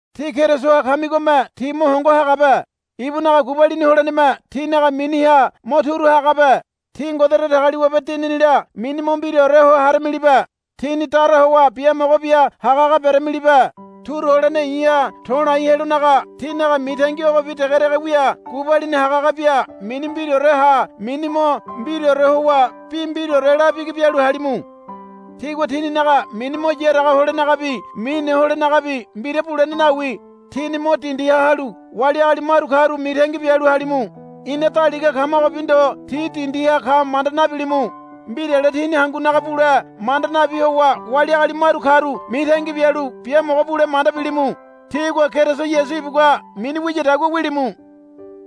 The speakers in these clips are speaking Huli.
Tí Kerisoha kamigome tí mo hongo hagabe. Ibunaga gubalini holeneme tínaga miniha mo turu hagabe. Tí Ngode Datagaliwabe Dininila mini mo mbiraore ho haramilibe. Tíni dara howa biamogo bia hagahaga beramilibe. Turu holene i̱ha to̱lai helonaga tínaga mitangi ogobi degedege wia gubalini hagahaga bia mini mbiraore ha mini mo mbiraore howa bi mbiraore la bigi bialu halimu. Tígua tíninaga mini mo yaraga holenagabi mine holenagabi mbira bulene nawi. Tíni mo dindiha halu wali agali maru karu mitangi bialu halimu. Ina daliga kamagobi ndo ti dindiha ka manda nabilimu. Mbirale tíni hangunaga bule manda nabi howa wali agali maru karu mitangi bialu biamogo bule manda bilimu. Tígua Keriso Yasu ibugua mini wiyadagua wilimu.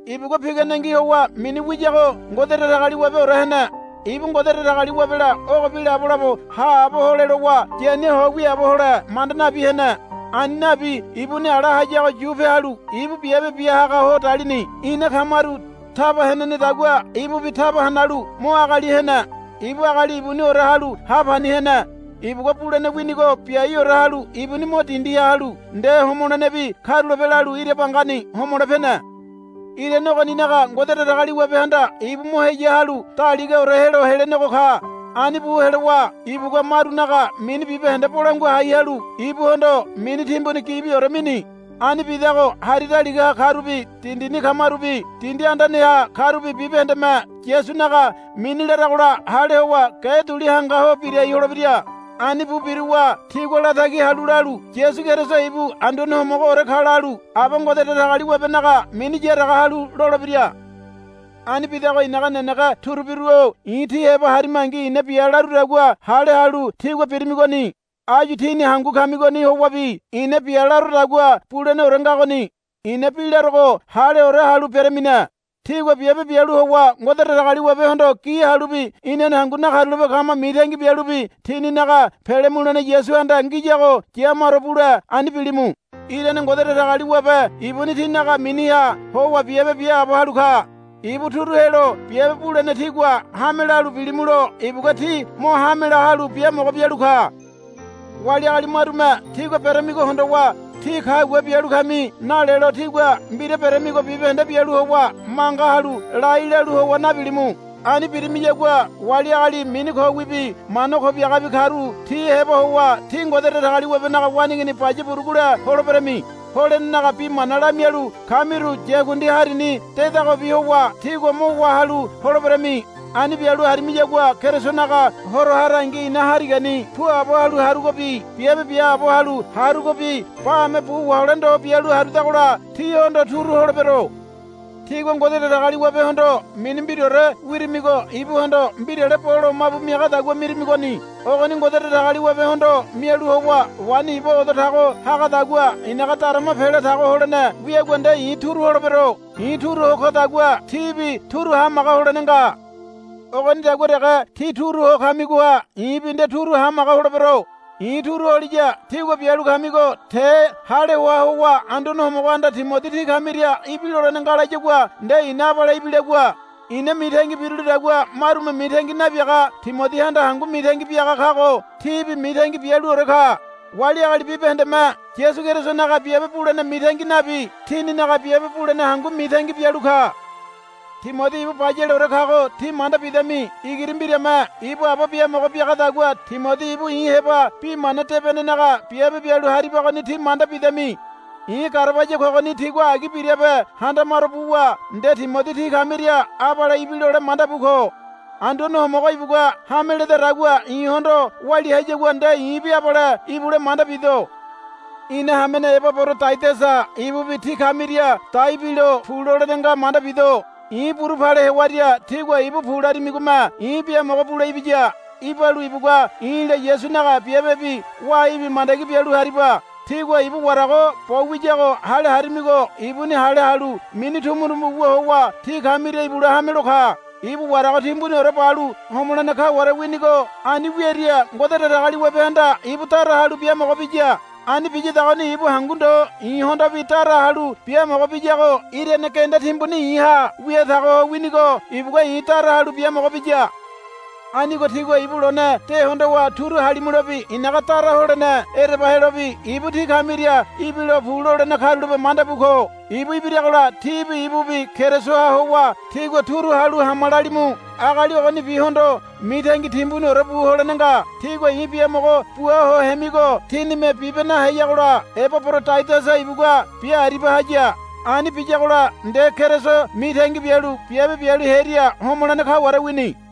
Ibugua piganengi howa mini wiyago Ngode Datagaliwabeore hene. Ibu Ngode Datagaliwabela ogobi labolabo haabo hole lowa yania ho wiaabo hole manda nabi hene. Ani nabi ibuni ala hayago yupe halu ibu biabe bia haga ho dalini. Ina kamaru taba henenedagua ibubi taba hanalu mo agali hene. Ibu agali ibuniore halu ha pani hene. Ibugua bulene winigo biaore halu ibuni mo dindiha halu nde homolenebi karulape lalu ira bangani homole pene. Irane ogoninaga Ngode Datagaliwabehanda ibu mo heya halu daligaore helo helenego ka. Ani bu helowa ibugua marunaga mini bibahende bolangua hai halu ibuhondo mini timbuni gibiore mini. Ani bidago hari daligaha karubi dindini kamarubi dindi andaneha karubi bibahendeme Yasunaga mini laragola hale howa ge duli hanga ho birai holebira. Ani bu biruwa tigua latagi halu lalu, Yasu Keriso ibu Anduane Homogoore ka, lalu Aba Ngode Datagaliwabenaga mini yaraga halu lolebira. Ani bidago i̱naga nenege turubiru-o i̱ tí heba harimangi i̱na bia larudagua hale halu tígua birimigoni. Áyu tíni hangu kamigoni howabi ina bia larodagua buleneore ngagoni. I̱na bi larogo haleore halu beramine. Tígua biabe bialu howa Ngode Datagaliwabehondo gi halubi inane hangu nakarulape kama mitangi bialubi tíninaga pele mulene Yasuhanda ngiyago ya maro bule ani bilimu. Irane Ngode Datagaliwabe ibuni tínaga miniha howa biabe biaabo halu ka. Ibu turu helo biabe bulene tígua hame lalu bilimulo ibugua tí mo hamela halu biamogo bialu ka. Wali agali marume tígua beramigo hondowa, Tí kagua bialu kami, nalelo tígua mbira beramigo bibahende bialu howa manga halu lai lalu howa nabilimu. Ani birimiyagua wali agali mini kowibi mana ko biagabi karu ti heba howa tí Ngode Datagaliwabenaga waneigini baya burugule holeberami. Holenenaga bi mana lamialu kamiru yakundi harini dedagobi howa tígua mo wá halu holeberami. Ani bialu harimiyagua Kerisonaga Horo harangi i̱na harigani puabo halu harugobi biabe biaabo halu harugobi bame bu wahole ndo bialu harudagola tíhondo turu holebero. Tígua Ngode Datagaliwabehondo mini mbiraore wirimigo ibuhondo mbirale bo lomabu miagadagua mirimigoni. Ogoni Ngode Datagaliwabehondo mialu howa waini iba odo tago hagadagua i̱naga darama pela tago holene wiagua nde i̱ turu holebero. I̱ turu ho kodagua tíbi turu hamaga holene nga. Ogonidagua dege tí turu ho kamigoha i̱bi nde turu hamaga holebero. I̱ turu holiya tígua bialu kamigo te hale hoa howa Anduane Homogohanda Timodi tí kamiria ibilolene nga layagua nde i̱na abale ibilagua. I̱na mitangi birulidagua marume mitangi nabiaga Timodihanda hangu mitangi biaga kago tíbi mitangi bialuore ka. Wali agali bibahendeme Yasu Kerisonaga biabe bulene mitangi nabi tininaga biabe bulene hangu mitangi bialu ka. Timodi ibu bayaleore kago tí manda bidami. Igiri mbirame ibu aba biamogo biagadagua Timodi ibu i̱ heba bi mana debenenaga biabe bialu haribagoni tí manda bidami. I̱ garabaya kogoni tigua agi birabe handamaro buwa nde Timodi tí kamiria abale ibilole manda bu ko. Anduane Homogo ibugua hame ledadagua i̱hondo walia hayagua nde i̱bi abale ibule manda bido. Ina hamene Ebaborodaidasa ibubi tí kamiria dai bilo pu lolene nga manda bido. I̱ buru pale hewaria tígua ibu, Pu, larimigome i̱ biamogo bule ibiya. Ibalu ibugua i̱la Yasunaga biabebi waibi mandagi bialu hariba. Tígua ibu warago bo wiyago hale harimigo ibuni hale halu mini tumutumu wu howa tí kamiria ibule hamelo ka. Ibu warago timbuniore balu homolene kaware winigo ani wiaria Ngode Datagaliwabehanda ibu dara halu biamogo biya. Ani biyadagoni ibu hangu ndo i̱hondobi dara halu biamogo biyago irane genda timbuni i̱ha wia tago ho winigo ibugua i̱ dara halu biamogo biya. Anigo tígua ibu lone de hondowa turu halimulobi i̱naga dara holene ereba helobi ibu tí kamiria ibilo pu lolene karulape manda bu ko. Ibu ibiragola tíbi ibubi Kerisoha howa tígua turu halu, Hama, lalimu. Agali ogonibihondo mitangi timbuniore bu holene nga. Tígua i̱ biamogo bua ho hemigo tínime bibe naheyagola Ebaborodaidasa ibugua bia aribia haya. Ani biyagola nde Keriso mitangi bialu biabe bialu hearia homolene kaware wini.